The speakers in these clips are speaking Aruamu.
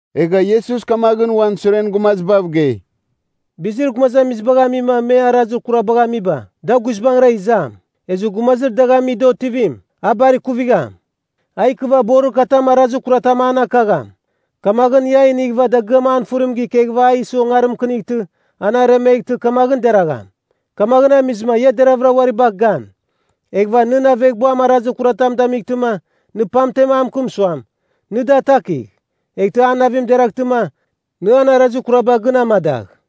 Egha Iesus kamaghɨn uan suren gumazibav gei, “Bizir gumazamizibagh amima me arazir kurabagh amiba. da guizbangɨra izam. Ezɨ gumazir dagh ami da otivim, a bar kuvigham. A ikɨva borir katam arazir kuratam an akagham, kamaghɨn ia a inighɨva dagɨam an fɨrim ikeghɨva a isɨ ongarim mɨkɨnightɨ, an aremeghtɨ, kamaghɨn deragham. Kamaghɨn amizɨma ia deravɨra uari bagh gan. “Eghɨva nɨn aveghbuam arazir kuratam damightɨma, nɨ pamtem a mɨkɨm suam, nɨ da atakigh. Eghtɨ a navim gɨraghtɨma, nɨ an arazir kuraba gɨn amada.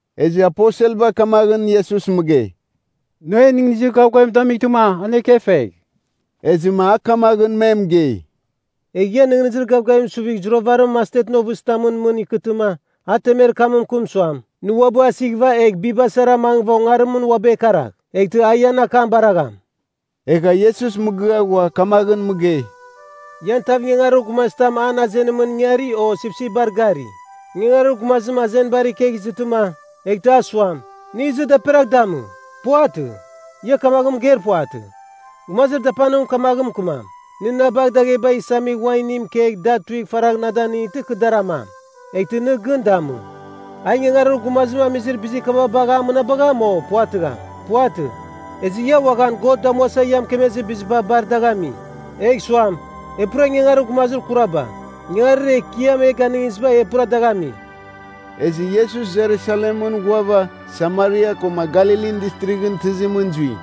Ezɨ aposelba kamaghɨn Iesus mɨgei, “Nɨ en nɨghnɨzir gavgavim damightɨma an ekefegh!” Ezɨma a kamaghɨn me mɨgei, “Egh ian nɨghnɨzir gavgavim suvigh zuravarim mastetɨn ovɨzitamɨn mɨn ikɨtɨma, ia temer kam mɨkɨm suam, ‘Nɨ uabɨ asighɨva egh biba sara mangɨva ongarimɨn uabɨ ekaragh,’ eghtɨ a ian akam baragham.” Egha Iesus mɨgɨa ghua kamaghɨn mɨgei, “Ian tav ingangarir gumazitam an azenimɨn ingari o sipsipbar gari. Ingangarir gumazim azenibar ikegh izɨtɨma, eghtɨ a suam, nɨ izɨ daperagh damɨ? Puvatɨ. Ia kamaghɨn mɨgeir puvatɨ. Gumazir dapanim kamaghɨn mɨkɨmam, nɨ na bagh dagheba isamigh uan inim kegh da tuigh faragh na danightɨ kɨ dar amam, eghtɨ nɨ gɨn damɨ. A ingangarir gumazim amizir bizir kaba bagha a mɨnabagham, o puvatɨgham? Puvatɨ. Ezɨ ia uaghan, God damuasa ia mɨkemezir biziba bar dagh ami, egh suam, E pura ingangarir gumazir kuraba, ingangarir Ekiam e ganɨngiziba e pura dagh ami.” Ezɨ Iesus Jerusalemɨn ghuava, Samaria koma Galilin Distrighɨn tɨzimɨn zui.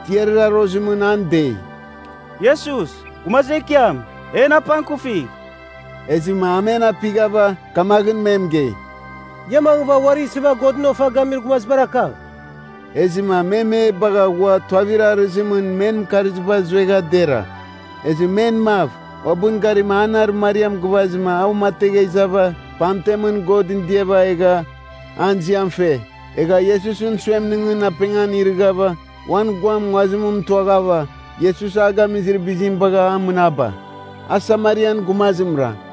tiarir arozimɨn an dei, “Iesus, Gumazir Ekiam, en apangkufigh.” Ezɨma a men apighava, kamaghɨn me mɨgei, “Ia mangɨva, uari isɨva Godɨn ofa gamir gumazibar akagh.” Ezɨma me me bagha ghua tuavir arɨzimɨn men mɨkarziba zuegha dera Ezɨ men mav, uabɨn garima an arɨmariam gɨvazɨma a uamategha izava pamtemɨn Godɨn diava egha an ziam fe. Egha Iesusɨn suemningɨn apengan irɨghava uan guam nguazim mɨtuaghava, Iesus a gamizir bizim bagha a mɨnaba. A Samarian gumazimra.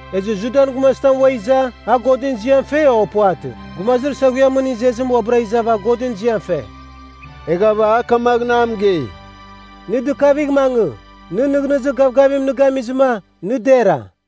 Ezɨ Judan gumazitam ua iza, a Godɨn ziam fe, o puvatɨ? Gumazir saghuiamɨn izezim uabɨra izava Godɨn ziam fe.” Eghava a kamaghɨn a mɨgei, “Nɨ dɨkavigh mangɨ. Nɨn nɨghnɨzir gavgavim nɨ gamizɨma, nɨ dera.”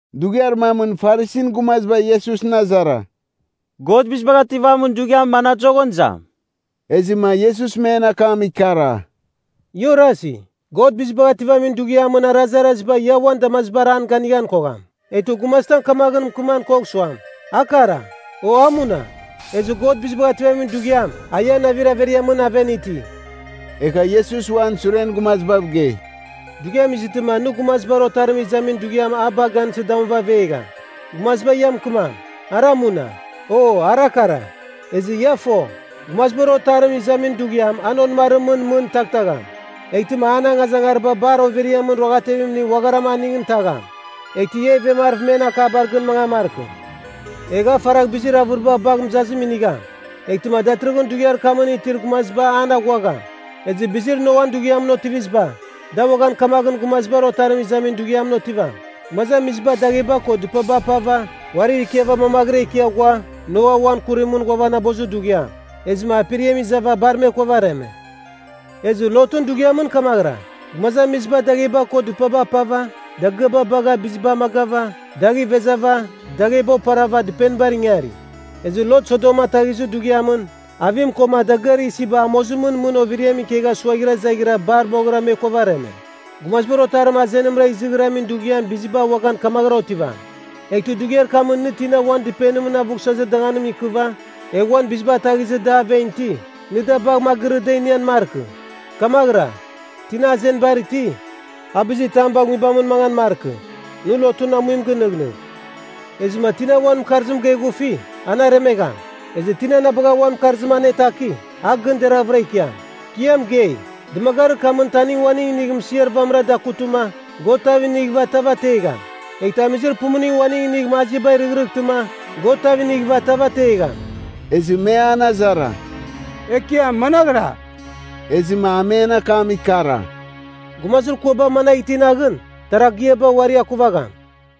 Dughiar mamɨn Farisin gumaziba Iesusɨn azara, “God Bizibagh Ativamin Dughiam mana dazoghɨn izam?” Ezɨma Iesus men akam ikara, “Ia orasi, God Bizibagh Ativamin Dughiamɨn arazaraziba ia uan damazibar an ganighan kogham. Eghtɨ gumazitam kamaghɨn mɨkɨman kogham suam, ‘A kara,’ o ‘A muna.’ Ezɨ God Bizibagh Ativamin Dughiam, a ian navir averiamɨn aven iti.” Egha Iesus uan suren gumazibav gei, “Dughiam izɨtɨma nɨ Gumazibar Otarim izamin dughiam a bagh gansɨ damuva avegham. Gumaziba ia mɨkɨmam, ‘Ara muna!’ o ‘Ara kara!’ Ezɨ ia fo, Gumazibar Otarim izamin dughiam an onɨmarimɨn mɨn taghtagham. Eghtɨma an angazangariba bar overiamɨn ruaghatevimning uagharam aningɨn tagham. Eghtɨ ia ivemarɨv men akaba gɨn mangan markɨ. Egh a faragh bizir avɨriba bagh mɨzazim inigham. Eghtɨma datɨrɨghɨn dughiar kamɨn itir gumaziba an aghuagham. “Ezɨ bizir Noan dughiamɨn otiviziba, da uaghan kamaghɨn Gumazibar Otarim izamin dughiamɨn otivam. Gumazamiziba dagheba ko dɨpaba apava, uarir ikiava mamaghɨra ikia ghua, Noa uan kurimɨn ghuavanabozir dughiam. Ezɨma aperiam izava bar me kuavareme. “Ezɨ Lotɨn dughiamɨn kamaghɨra, gumazamiziba dagheba ko dɨpaba apava, dagɨaba bagha biziba amagava, dagh ivezava, dagheba oparava dɨpenibar ingari. Ezɨ Lot Sodom ataghizir dughiamɨn, avim koma dagɨar isiba amozimɨn mɨn overiamɨn ikegha suaghira izaghɨra bar moghɨra me kuavareme. “Gumazibar Otarim azenimra izighramin dughiam biziba uaghan kamaghɨram otivam. Eghtɨ dughiar kamɨn nɨ tina uan dɨpenimɨn avughsɨzir danganim ikɨva, egha uan biziba ataghizɨ da aven iti, nɨ da bagh magɨrɨ da inian markɨ. Kamaghɨra, tina azenibar iti, a bizir tam bagh nguibamɨn mangan markɨ. Nɨ Lotɨn amuim gɨnɨghnɨgh! Ezɨma tina uan mɨkarzim geghufi, an aremegham. Ezɨ tina na bagha uan mɨkarzim anataki, a gɨn deraghvɨra ikiam. Kɨ ia mɨgei, dɨmagarir kamɨn taning uaning inigh mɨsiar vamɨra dakutɨma, God tav inighɨva tav ategham. Eghtɨ amizir pumuning uaning inigh maziaba rɨghrɨghtɨma, God tav inighɨva tav ategham.” Ezɨ me an azara, “Ekiam managhɨra?” Ezɨma a men akam ikara, “Gumazir kuaba managh iti naghɨn, taragiaba uari akuvagham.”